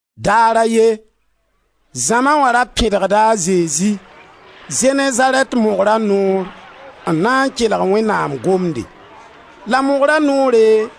Daar a ye, Zãma wã ra pẽdgda a Zezi, Zenezarɛt mogra noor, n na n kelg Wẽnnaam gomde. La mogra noore,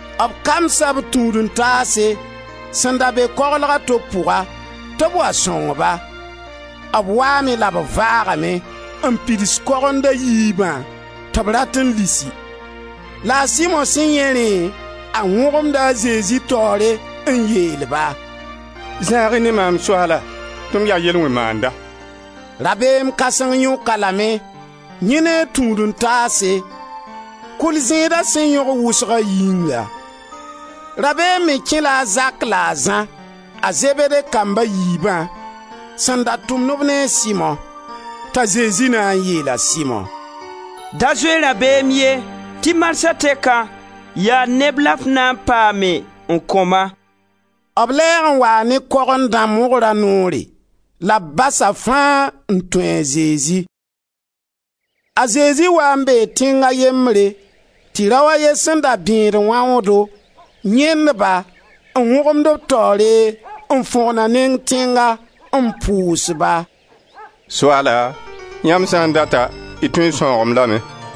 B kamsa b tũud-n-taase sẽn da be koglg a to pʋga, tɩ b wa sõng-ba. B waame la b vaagame n pids kogend a yiibã tɩ b rat n lisi. La a Simo sẽn yãe rẽ, a wõgemda a Zezi taoore n yeel-ba: «Zãag-y ne maam, Soaala, tɩ m yaa yel-wẽn-maanda.» Rabeem kãseng yõk-a lame, yẽ ne a tũud-n-taase, kʋɩl-zẽeda sẽn yõg wʋsga yĩnga. Rabeem me kẽ-la a Zak la a Zã, a Zebede kamb a yiibã, sẽn da tʋmd ne a Simo. T'a Zezi na n yeel a Simo: «Da zoe rabeem ye tɩ marsã tɛka, yaa neb la f na n paame n kõ-ma.» B lɛɛg n waa ne kogendã mogra noore la b basa fãa n tũ a Zezi. A Zezi waa n bee tẽng a yembre tɩ rao a ye sẽn da bẽed wãoodo yãend-ba, n wõgemd b taoore n fõgna a neng tẽnga, n pʋʋs-ba: «Soaala, yãmb sã n data, y tõe n sãoog-m lame.»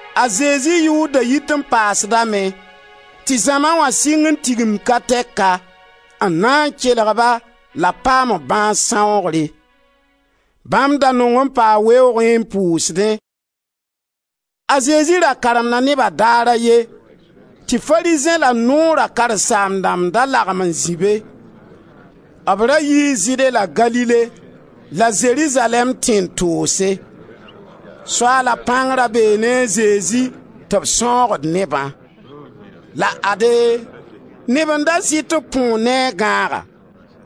A Zezi yʋʋr da yit n paasdame tɩ zãma wã sɩng n tigimd ka tɛka, n na n kelg-ba la b paam b bãas sãoogre. Bãmb da nong n paa weoogẽ n pʋʋsdẽ. A Zezi ra karemda neba daar a ye, tɩ Farizẽ la noora karen-saam-dãmb da lagem n zĩ be; b ra yii Zɩɩde la Galile la Zerizalɛɛm tẽn-toose. Soaala pãng ra bee ne a Zezi tɩ b sãoogd nebã. La ade neb n da zɩt b põor ne a gãaga,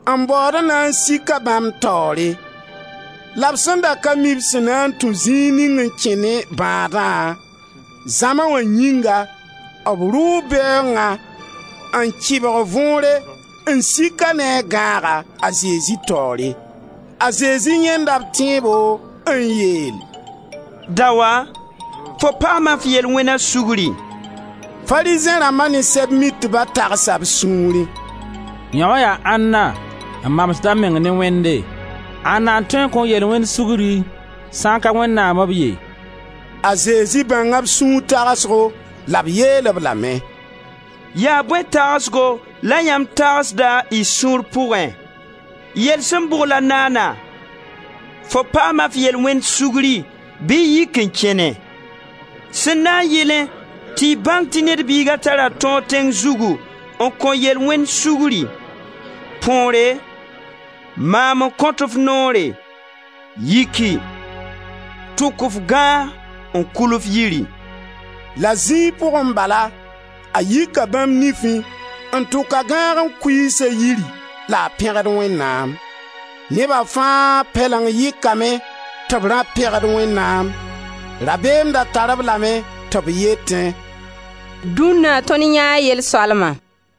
n baood n na n sik-a bãmb taoore. La b sẽn da ka mi b sẽn na n tũ zĩig ning n kẽ ne bãadã, zãma wã yĩnga, b rʋʋ bɛoongã n kɩbg võore n sik-a ne a gãagã, a Zezi taoore. A Zezi yãenda b tẽebo n yeel: «Daoa, fo paama f yel-wẽna sugri.» Farizẽ rãmba ne Sɛb-mitba tagsa b sũurẽ: «Yãoo yaa ãnna n mamesd a meng ne Wẽnde? Anna n tõe n kõ yel-wẽnd sugri, sã n ka Wẽnnaam b ye?» A Zezi bãnga b sũur tagsgo la b yeel-b lame: «Yaa bõe tagsgo la yãmb tagsda y sũur pʋgẽ? Yelsem bʋg la naana: fo paama f yel-wẽnd sugri, bɩ: yik n kẽne? Sẽn na n yɩlẽ tɩ y bãng tɩ Ned Biiga tara tõog tẽng zugu, n kõ yel-wẽnd sugri, põore, maam n kõt f noore: yiki! Tʋk f gãag n kul f yiri!» La Zĩig pʋgẽ bala, a yika bãmb nifẽ, n tʋk a gãag n kuiis a yiri la a pẽgd Wẽnnaam. Neba fãa pɛleng yɩkame tɩ b ra pẽgd Wẽnnaam; rabeem da tar-b lame tɩ b yetẽ: «Dũnna tõnd yãee yel-soalma.»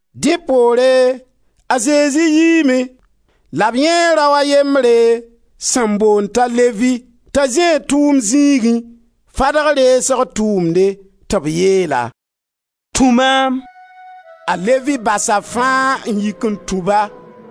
Dẽ poore a Zezi yiime la b yãee rao a yembre sẽn boond t'a Levi, t'a zĩ a tʋʋmd zĩigẽ, fadg reesg tʋʋmde, tɩ b yeel-a: «Tũ maam!» A Levi basa fãa n yik n tũ-ba.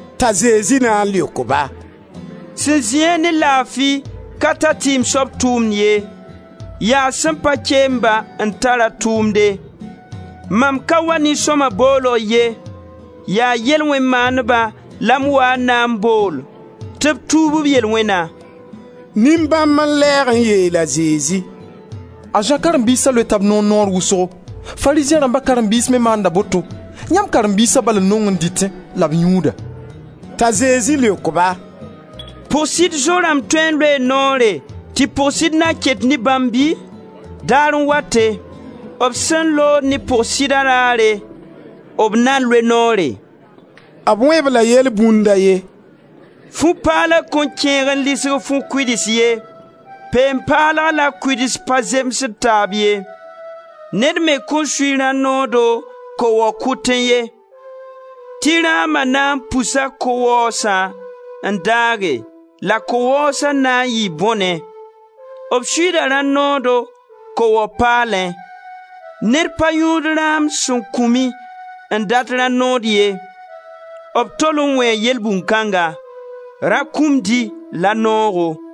T'a Zezi na n leok-ba: «Sẽn zĩ-a ne laafi ka tar tɩɩm soab tʋʋmd ye, yaa sẽn pa keem-bã n tar a tʋʋmde. Mam ka wa nin-sõma boolg ye, yaa yel-wẽn-maandba la m wa n na n bool tɩ b tuub b yel-wẽna.» Nim-bãmb n lɛɛg n yeel a Zezi: «A Zã karen-biisa loeta b noor naoor wʋsgo. Farizẽ rãmba karen-biis me maanda boto. Yãmb karen-biisa bala n nong n dɩtẽ la b yũuda.» T'a Zezi leok-ba: «Pʋg-sɩd zo-rãmb tõe n loee noore tɩ pʋg-sɩd nan ket ne bãmb bɩ? Daar n wate. B sẽn loog ne pʋg-sɩdã raare, b na loe noore.» B wẽ-b la yelbũnd a ye: «Fu-paalg kõ kẽeg n lisg fu-kʋɩds ye, peen-paalg la kʋɩds pa zemsd taab ye. Ned me kõn sui rã-noodo, ko-wao kʋtẽ ye, tɩ rãama na n pusa ko-waoosã n daage la ko-waoosa na n yɩɩ bõne. B suiida rã-noodo ko-wao paalẽ. Ned pa yũud rãam sẽn kũmi n dat rã nood ye. B tol n wẽe yelbũnd kãnga: rã kũmdi la noogo.»